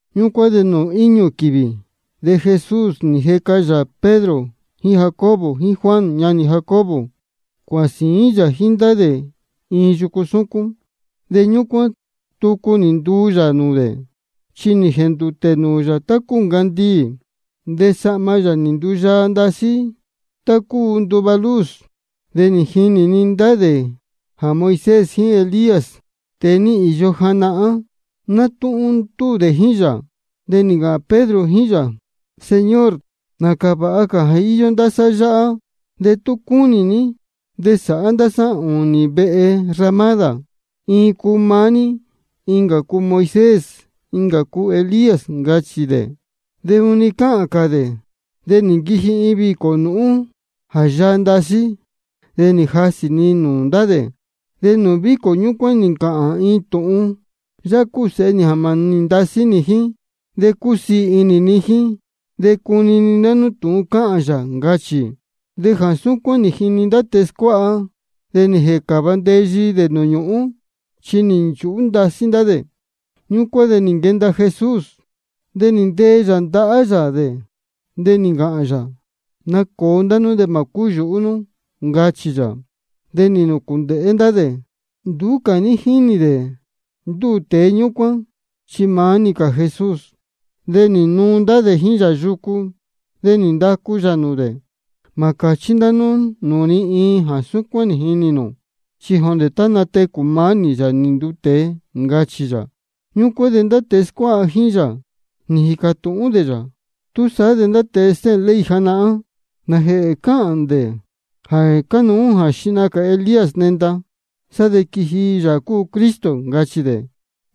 Ñúcuán de nūū íñū quīvī de Jesús nī jeca yā Pedro jíín Jacobo jíín Juan ñanī Jacobo, cuāhān sīín yā jíín ndá dē iin yucu súcún. De ñúcuán, tucu nī nduu yā nūū dē. Chi nī jēndūtē nūū yā tá cúu ncandiī. De sahma yā nī nduyaa ndasí tá cúu nduva luz. De nī jinī-ni ndá dē jā Moisés jíín Elías, tēe nī īyo janahán, nátúhún ndúū dē jíín yā. De nī ncāhān Pedro jíín yā: Señor, nācā vāha jā íyó ndá sá yáhá. De tú cúnī ní de ná sáhá ndá sá ūnī vehe ramádā, iin cuu maá ní, incā cuu Moisés, de incā cuu Elías, ncachī dē. De juni cáhān cā dē, de nī nquiji iin vīcō nūhún jā yaa ndasí, de nī jasī-ni nūū ndá dē. De nūū vīcō ñúcuán nī ncāhān iin tūhun: Yáhá cúu Sēhe nī jā mānī ndasí nī jíín, de cúsiī inī ni jíín. De cunini ndá nú tūhun cáhān yā, ncachī. De jā súcuán nī jini ndá tēe scuáha, de nī jēcāva ndeyi dē nūū ñūhún, chi nī nchūhú ndasí ndá dē. Ñúcuán de nī nquenda Jesús, de nī ntee yā ndahá yā dē, de nī ncāhān yā: Nacōo ndá nú de mā cúyūhú nú, ncachī yā. De nī nūcūndēhé ndá dē, de nduú cā ní jínī dē ndúū tēe ñúcuán, chi maá-ni cā Jesús. De nī nuu ndá dē jíín yā yucu. De nī ndacu yā nūū dē: Mā cāchí ndá nú nūū ni iin jā súcuán nī jinī nū, chi jondē tá natecū maá nī, Yāā nī nduu tēe, ncachī yā. Ñúcuán de ndá tēe scuáha jíín yā, nī jīcā tūhún dē yā: Túsaá de ndá tēe stéhēn ley janahán, ¿nājēhē cáhān dē jā cánuú jā xihna cā Elías nenda, sá de quiji Yāā cúu Cristo? ncachī dē.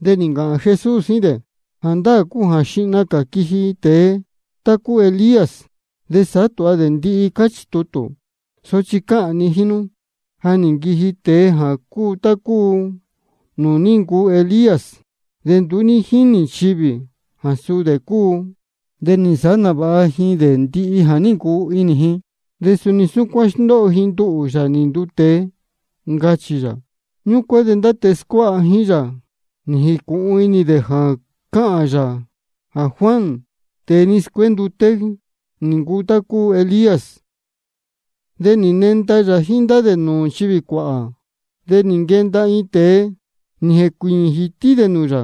De nī ncāhān Jesús jíín dē: Jāndáā cúu jā xihna cā quiji iin tēe cuu tá ncuu Elías, de sāhá tūha dē ndihi, cáchī tutū. Sochi cáhān ni jíín nú, ja nī nquiji tēe jāá ncuu tá cúu nūū ní ncuu Elías, de nduú ní jínī nchivī jā suu dē cúu. De nī nsāhá nāvāha ji dē ndihi jā ní ncuu inī ji. De suni súcuán sndóho ji nduhū, Yāā nī nduu tēe, ncachī yā. Ñúcuán de ndá tēe scuáha jíín yā nī jīcūhun inī dē jā cáhān yā jā Juan, tēe nī scuénduté, nī ncuu dē tá ncuu Elías. De nī nenda yā jíín ndá dē nūū nchivī cuāhā. De nī nquenda iin tēe, nī jēcuīñī jītí dē nūū yā,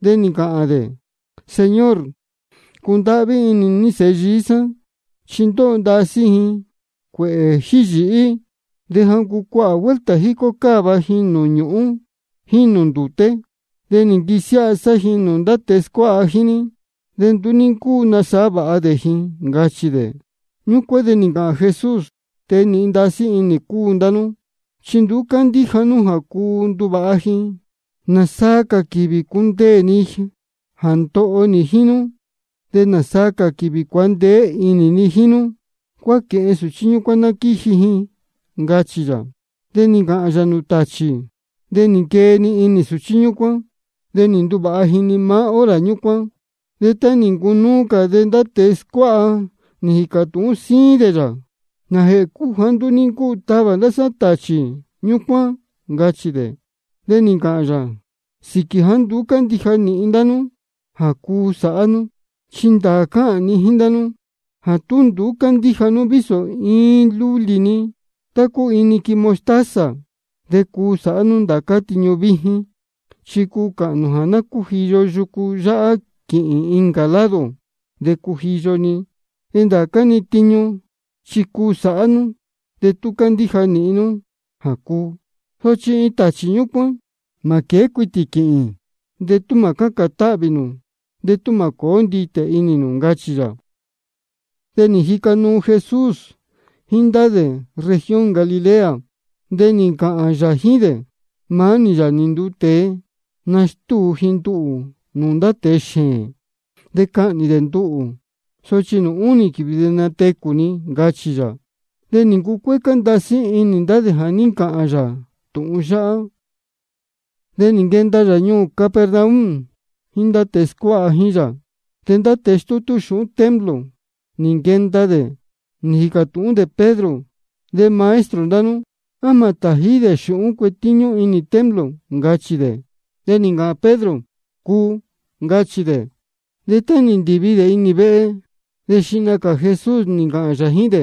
de nī ncāhān dē: Señor, cundáhví inī ní sēhe yií sá, chi ndóho ndasí ji cuēhē jíhī yīhí. De ja ncuu cuāhā vuelta jícó cáva ji nūū ñúhūn jíín nūū ndūté. De nī nquisiáha sá ji nūū ndá tēe scuáha jíín ní, de nduú ní ncúu nasāhá vāha dē ji, ncachī dē. Ñúcuán de nī ncāhān Jesús: Tēe nīhin ndasí inī cúu ndá nú chi nduú cándíja nú jā cuu nduvāha ji. ¿Nāsaa cā quīvī cundeē ni jā ndoho nī jíín nú? ¿De nāsaa cā quīvī cuandeé inī ni jíín nú? Cuáquēhen sūchí ñúcuán ná quíji ji, ncachī yā. De nī ncāhān yā nūū tāchī, de nī nquee-ni inī sūchí ñúcuán. De nī nduvāha ji-ni maá hora ñúcuán. De tá nī ncunúú cā de ndá tēe scuáha nī jīcā tūhún síín dē yā: ¿Nājēhē cúu jāá nduú ní ncúu tavā ndá sá tāchī ñúcuán? ncachī dē. De nī ncāhān yā: Sīquī jāá nduú cándíja nīhin ndá nú jā cuu sāhá nú. Chi ndāā cáhān ni jíín ndá nú jā tú cándíja nú vísō iin lulī-ni tá cúu iin niquin mostaza, de cuu sāhá nú ndācá-ni tiñu víjín. Chi cuu cāhān nū jā ná cújiyo yucu yáhá quīhīn incā lado, de cujiyo-ni. De ndācá-ni tiñu chi cuu sāhá nú, de tú candíja nīhin nú jā cuu. Sochi iin tāchī súcuán, mā quēé cuitī quīhīn de tú mā cácān táhvī nū de tú mā cōó nditē inī nū, ncachī yā. De jíca nuu Jesús jíín ndá dē región Galilea, de nī ncāhān yā jíín dē: Maá nī, Yāā nī nduu tēe, nastúu ji nduhū nūū ndá tēe xēēn. De cahnī dē nduhū, sochi nūū únī quīvī de natecū ni, ncachī yā. De nī ncucuécá ndasí inī ndá dē jā ní ncāhān yā tūhun yáhá. De nī nquenda yā ñuū Capernaum jíín ndá tēe scuáha jíín yā. De ndá tēe stútú xūhún templo nī nquenda dē, de nī jīcā tūhún dē Pedro: De maestro ndá nú, ¿á mā tājí dē xūhún cuetíñú inī templo? ncachī dē. De nī ncāhān Pedro: Cuu, ncachī dē. De tá nī ndīvi dē inī vehe, de xihna cā Jesús nī ncāhān yā jíín dē: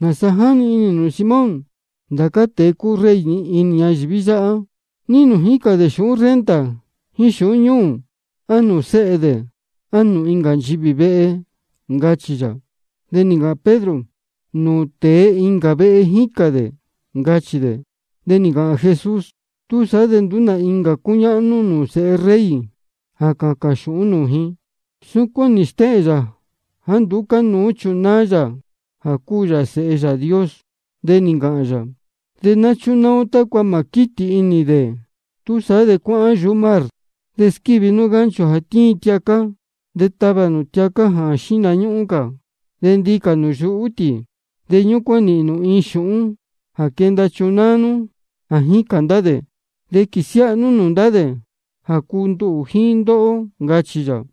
¿Nāsa jáni inī nū, Simón? Ndācá tēe cúu rey inī ñayīví yáhá, ¿ní nūū jícān dē xūhún renta jíín xūhún ñúū? ¿A nūū sēhe dē, á nūū nchivī incā vehe? ncachī yā. De nī ncāhān Pedro: Nūū tēe incā vehe jícān dē, ncachī dē. De nī ncāhān Jesús: Túsaá de nduú nā incā cúñáhnú nūū sēhe rey jā cācān xūhún nūū ji. Súcuán nī stéhēn yā jāá nduú cánuú chunáá yā jā cúu yā Sēhe Yāā Dios. De nī ncāhān yā: De ná chúnáá ó tácua mā squítī inī ō dē. Túsaá de cuáhán yuhú mar, de squívi nú gancho jā tíin tiacá, de tavā nū tiacá jā tíin xihna cā. De ndicā nū yuhú tī, de ñúcuán nīhīn nū iin xūhún jā quenda chunáá nú jā jícān ndá dē. De quīsiáha nú nūū ndá dē jā cuu nduhū jíín ndóhó, ncachī yā.